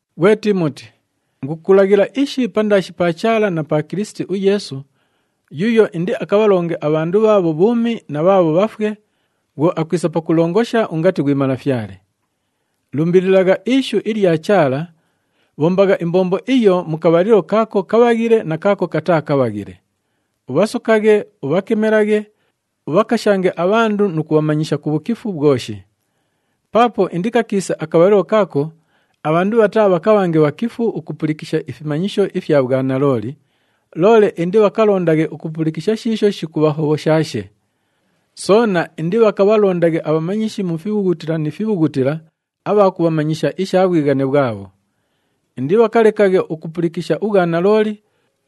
Ghwe Tiimoti, ingukulaghila ishi pandaashi pa Chaala na pa Kilisiti uYeesu, yuuyo indiakabhalonge abhandu bhaabho bhuumi na bhaabho bhafwe bhwo akwisa pakulongosha ungati ghwi Malafyale. Lumbililagha ishu ilya Chaala, bhombagha imbombo iyo mu kabhalilo kaako kabhaghile na kaako kataa kabhaghile. Ubhasokaghe, ubhakemelaghe, ubhakashange abhandu nu kubhamanyisha ku bhukifu bhwoshi. Paapo indikakiise akabhalilo kaako abhandu bhataabhakabhange bhakifu ukupulikisha ifimanyisho ifya bhwanalooli, loole indibhakalondaghe ukupulikisha shiisho shikubhahobhoshaashe. Soona indibhakabhalondaghe abhamanyishi mu fibhughutila ni fibhughutila abha kubhamanyisha isha bhwighane bhwabho. Indibhakalekaghe ukupulikisha ubhwanalooli,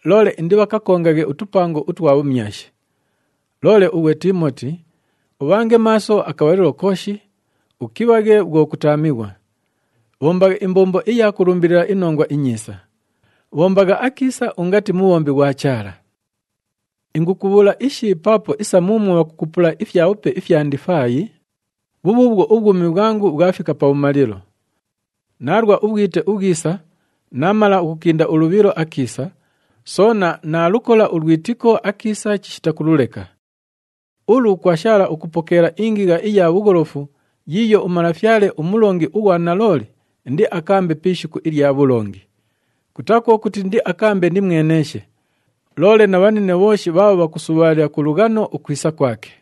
loole indibhakakongaghe utupango utwa bhumyashi. Loole ughwe Tiimoti, ubhange maaso akabhalilo kooshi, ukibhaghe bhwo kutaamighwa. Bhombagha imbombo iya kulumbilila iNongwa iNyiisa. Bhombagha akiisa ungati mubhombi ghwa Chaala. Ingukubhuula ishi paapo isa muumwo bhakukupula ifyabhupe ifya ndifaayi, bhubhuubhwo ubhwumi bhwangu bhwafika pabhumalilo. Naalwa ubhwite ubhwisa, naamala ukukinda ulubhilo akiisa, soona naalukola ulwitiko akiisa chishita kululeka. Ulu kwashaala ukupokeela ingigha iya bhugholofu yiiyo uMalafyale, uMulongi ughwa nalooli indiakaambe pi ishiku ilya bhulongi. Kutaa kwo kuti indiakaambe nimweneeshe, loole na bhanine bhooshi bhaabho bhakusubhaalila ku lughano ukwisa kwake.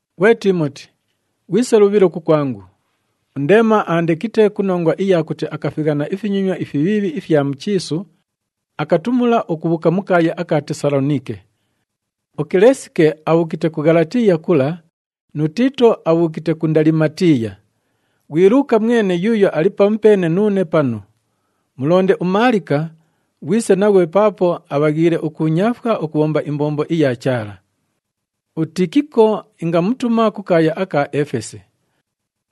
Ghwe Tiimoti, ghwise lubhilo kukwangu. UNdeema aandekite ku nongwa iya kuti akafighana ifinyonywa ifibhiibhi ifya mu chiisu, akatumula ukubhuuka mu kaaya aka Tesaloniike. UKilesike abhuukite ku Ghalatiiya kula nu Tiito abhuukite ku Ndalimatiiya. Ghwi Luuka mwene yuuyo ali pamupeene nuune panu. Mulonde uMaalika, ghwise naghwe paapo abhaghiile ukuunyaafwa ukubhomba imbombo iya Chaala. UTikiko ingamutuma ku kaaya aka Efesi.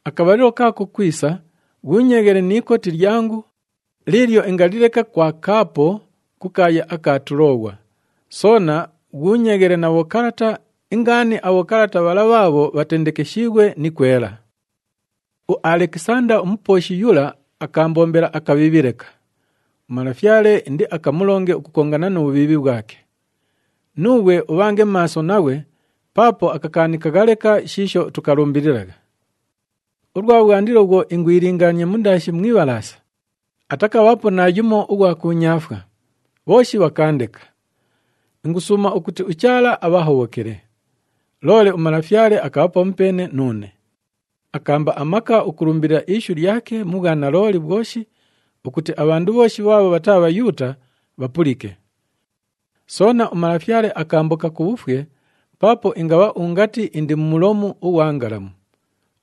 Akabhalilo kaako kwisa, ghuunyeeghele ni ikoti lyangu liilyo ingalileka kwa Kaapo ku kaaya aka Tulooghwa, soona ghuunyeeghele na bhokalata, ingaani abhokalata bhala bhaabho bhatendekeshiighwe ni kwela. UAlekisanda umupooshi yula akaambombela akabhiibhi leka. UMalafyale indiakamulonge ukukongana nu bhubhiibhi bhwake. Nuughwe ubhange maaso naghwe paapo akakaanikagha leka shiisho tukalumbililagha. Ulwa bhwandilo bhwo ingwilingaania mundaashi mu ibhalaasa, atakabhaapo naayumo ughwa kuunyaafwa, bhooshi bhakaandeka. Ingusuuma ukuti uChaala abhahobhokele. Loole uMalafyale akabha pamupeene nuune. Akaamba amaka ukulumbilila ishu lyake mu bhwanalooli bhwoshi ukuti abhandu bhooshi bhaabho bhataa Bhayuuta bhapulike. Soona, uMalafyale akaamboka ku bhufwe paapo ingabha ungati indi mu mulomu ughwa ngalamu.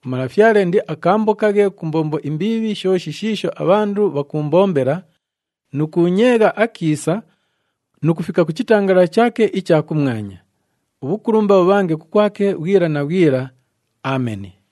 UMalafyale indiakaambokaghe ku mbombo imbiibhi shooshi shiisho abhandu bhakuumbombela nu kuunyeegha akiisa nu kufika ku chitangalala chaake icha kumwanya. Ubhukulumba bhubhange kukwake bhwila na bhwila. Ameni.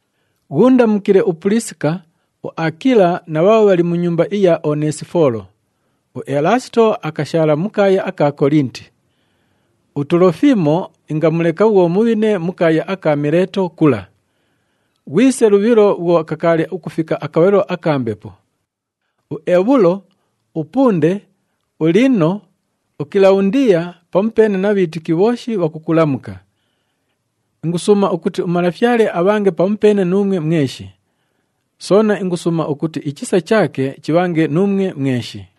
Ghuundamukile uPuliisika, uAakila na bhaabho bhali mu nyumba iya Oneesifoolo. UElaasito akashaala mu kaaya aka Kolinti. UTulofimo ingamuleka bhwo mubhine ku kaaya aka Mileeto kula. Ghwise lubhilo bhwo kakaali ukufika akabhalilo aka mbepo. UEbhulo, uPunde, uLiino, uKilabhundiya pamupeene na bhiitiki bhooshi bhakukulamuka. Ingusuuma ukuti uMalafyale abhange pamupeene nuumwe mweshi. Soona ingusuuma ukuti ichisa chaake chibhange nuumwe mweshi.